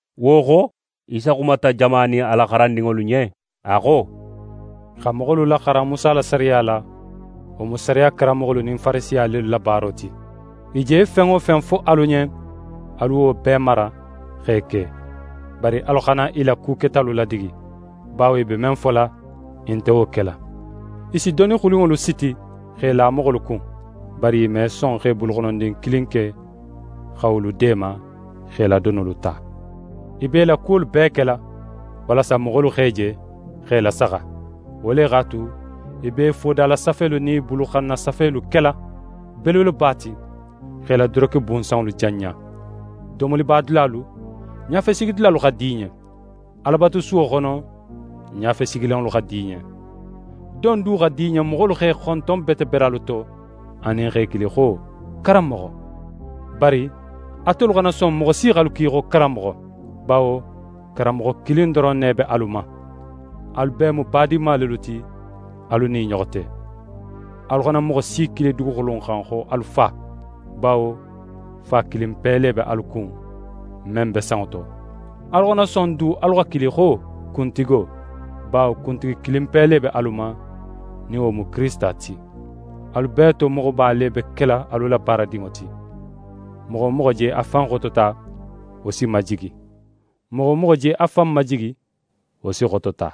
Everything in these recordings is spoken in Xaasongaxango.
Wo xo, Isa xumata jama nin a la xarandinŋolu ɲen. A xo: «Xa moxolu laxaran Musa la sariya la, wo mu sariya karanmoxolu nin Farisiya lelu la baaro ti. I je fen wo fen fo alu ɲen, alu wolu bee mara x'e ke. Bari alu xana i la ku ketalu ladigi, bawo i be men fola, i nte wo kela. I si doni xulinŋolu siti x'e la moxolu kun, bari i me son x'e buluxonondin kilin ke xa wolu deema x'e la donolu ta. I be i la kuwolu bee kela, walasa moxolu x'e je x'e lasaxa. Wo le x'a tu, i b'e fodalasafelu nin i buluxan na safelu kela belebeleba ti, x'e la doroke bunsanŋolu janɲa. Domoliba dulalu, ɲafesigidulalu xa di i ɲen. Alabatusuwo xono, ɲafesigilanŋolu xa di i ɲen. Don du xa di i ɲen moxolu x'e xonton bete beralu to anin x'e kili xo “Karanmoxo.” Bari atelu xana son moxo si x'alu kili xo “Karanmoxo”; bawo Karanmoxo kilin doron ne be alu ma. Alu bee mu badinma lelu ti alu nin i ɲoxo te. Alu xana moxo si kili duguxulu in xan xo alu “Fa”; bawo Fa kilinpe le be alu kun, men be sanŋo to. Alu xana son du alu xa kili xo “Kuntigo”; bawo Kuntigi kilinpe le be alu ma, nin wo mu Kirisita ti. Alu bee to moxoba le be kela alu la baaradinŋo ti. Moxo wo moxo je a fan xotota, wo si majigi; moxo wo moxo je a fan majigi, wo si xotota.»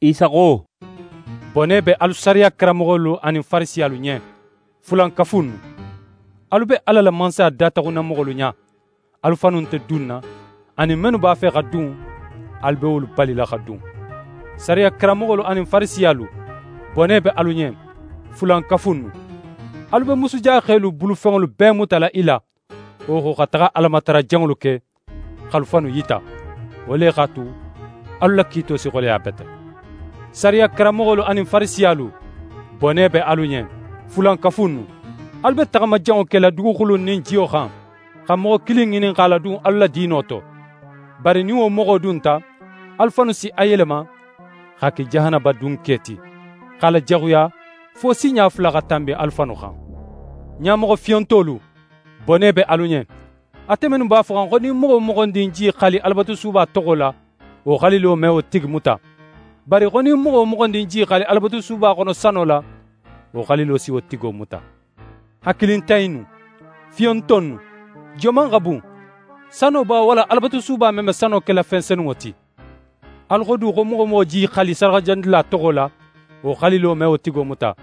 Isa xo: «Bone be alu sariya karanmoxolu anin Farisiyalu ɲen! Fulankafu innu! Alu be Ala la Mansaya dataxunna moxolu ɲa; alu fannu nte dunna anin mennu b'a fe xa dun, alu be wolu balila xa dun. [ «Sariya karanmoxolu anin Farisiyalu, bone be alu ɲen! Fulankafu innu! Alu be musujaxelu bulufenŋolu bee mutala i la, wo xo, xa taxa Alamatara janŋolu ke, x'alu fannu yita. Wo le x'a tu, alu la kiito si xoleya bete.] «Sariya karanmoxolu anin Farisiyalu, bone be alu ɲen! Fulankafu innu! Alu be taxama janŋo kela duguxulo nin jiyo xan, xa moxo kilin ŋinin x'a ladun alu la diino to. Bari nin wo moxo dunta, alu fannu si a yelema x'a ke jahanaba dunke ti, x'a lajaxuya fo sinɲa fula xa tanbi alu fannu xan. «Ɲamoxo fiyontolu, bone be alu ɲen! Ate mennu b'a foxan xo nin moxo wo moxondin je í xali Alabatusuba toxo la, wo xalilo me wo tigi muta; bari xo nin moxo wo moxondin je í xali Alabatusuba xono sano la, wo xalilo si wo tigo muta. Hakilintan innu! Fiyonto innu! Joman xa bun? Sano ba, walla Alabatusuba men be sano kela fen senunŋo ti? Alu xo du xo moxo wo moxo je í xali sadaxajanidula toxo la, wo xalilo me wo tigo muta.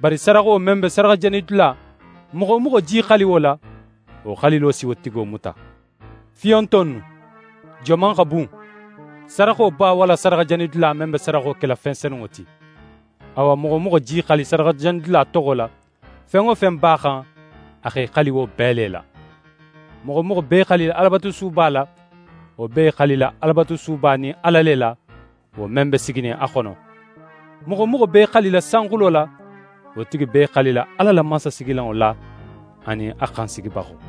Bari sadaxo men be sadaxajanidula, moxo wo moxo je í xali wo la, wo xalilo si wo tigo muta. Fiyonto innu! Joman xa bun? Sadaxo ba, walla sadaxajanidula, men be sadaxo kela fen senunŋo ti? Awa, moxo wo moxo je í xali sadaxajanidula toxo la, fen wo fen b'a xan, a x'é xali wo bee le la. Moxo wo moxo be í xalila Alabatusuba la, wo be í xalila Alabatusuba nin Ala le la, wo men be siginin a xono. Moxo wo moxo be í xalila sanxulo la, wo tigi be í xalila Ala la mansasigilanŋo la anin a xansigibaxo.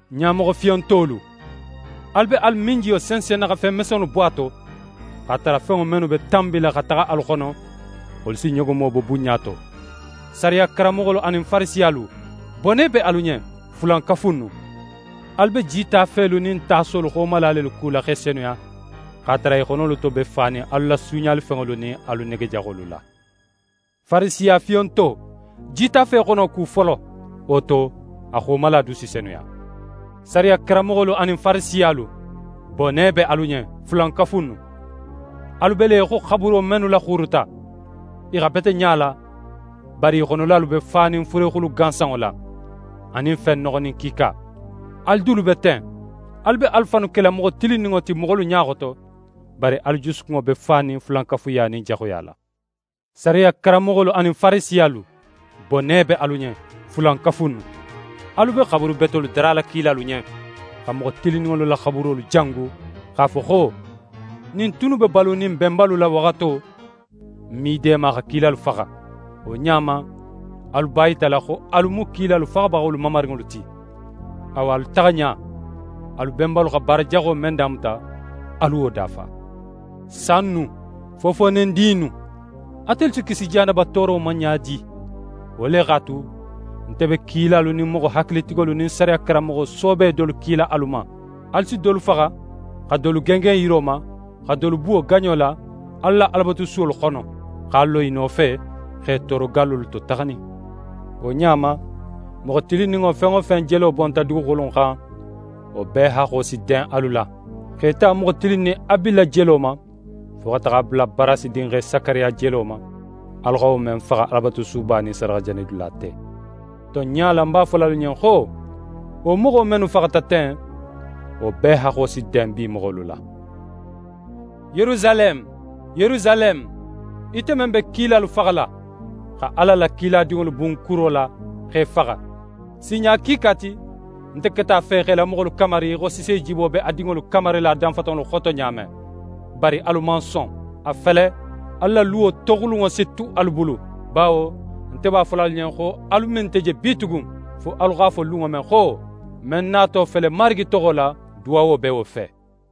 Ɲamoxo fiyontolu. Alu be alu minjiyo sensenna xa fen mesenŋolu bo a to, x'a tara fenŋo mennu be tanbila xa taxa alu xono, wolu si ɲogomo bo bunɲa to. «Sariya karanmoxolu anin Farisiyalu, bone be alu ɲen! Fulankafu innu! Alu be jitafelu nin tasolu xomala lelu kula x'e senuya, x'a tara i xonolu to be fanin alu la suuɲalifenŋolu nin alu nege jaxolu la. Farisiya fiyonto! Jitafe xono ku folo, wo to, a xomala du si senuya. «Sariya karanmoxolu anin Farisiyalu, bone be alu ɲen! Fulankafu innu! Alu be le í xo xaburo mennu laxuuruta; i xa bete ɲa la, bari i xonolalu be fanin fure xulu gansanŋo la, anin fen noxonin kiika. Alu dulu be ten. Alu be alu fannu kela moxo tilinninŋo ti moxolu ɲa xoto, bari alu jusukunŋo be fanin fulankafuya nin jaxuya la. «Sariya karanmoxolu anin Farisiyalu, bone be alu ɲen! Fulankafu innu! Alu be xaburu betolu darala kilalu ɲen, xa moxo tilinninŋolu la xaburolu jangu, x'a fo xo: “Nin n tunnu be balunin n benbalu la waxato, n me i deema xa kilalu faxa.” Wo ɲa ma, alu b'a yitala xo alu mu kilalu faxabaxolu mamarinŋolu ti. Awa, alu taxa ɲa, alu benbalu xa baara jaxo men damuta, alu wo dafa. Sa innu! Fofoonedin innu! Atelu si kisi jahanaba tooro ma ɲa di? Wo le x'a tu, nte be kilalu nin moxo hakilitigolu nin sariya karanmoxo soobe dolu kila alu ma. Alu si dolu faxa, xa dolu gengen yiro ma, xa dolu buwo gaɲo la alu la Alabatusuwolu xono, x'a lo i nofe, x'e tooro gallolu to taxanin. Wo ɲa ma, moxo tilinninŋo fen wo fen jelo bonta duguxulu in xan, wo bee haxxo si den alu la, x'é ta moxo tilinnin Abila jelo ma, fo xa taxa a bula Barasi dinxe Sakariya jelo ma, alu xa wo men faxa Alabatusuba nin sadaxajanidula te. Tonɲa la, ń b'a fola alu ɲen xo: Wo moxo mennu faxata ten, wo bee haxxo si den bi moxolu la.» «Yerusaleme, Yerusaleme, ite men be kilalu faxala, xa Ala la kiladinŋolu bun kuro la x'e faxa! Sinɲa kiika ti, nte keta a fe x'é la moxolu kamari í xo sisejibo be a dinŋolu kamarila a danfatanŋolu xoto ɲa men. Bari alu man son. A fele, alu la luwo toxulunŋo si tu alu bulu. Bawo nte b'a fola alu ɲen xo, alu me nte je bitugun, fo alu x'a fo lunŋo men xo: “Men nato fele Marigi toxo la, duwawo be wo fe!”»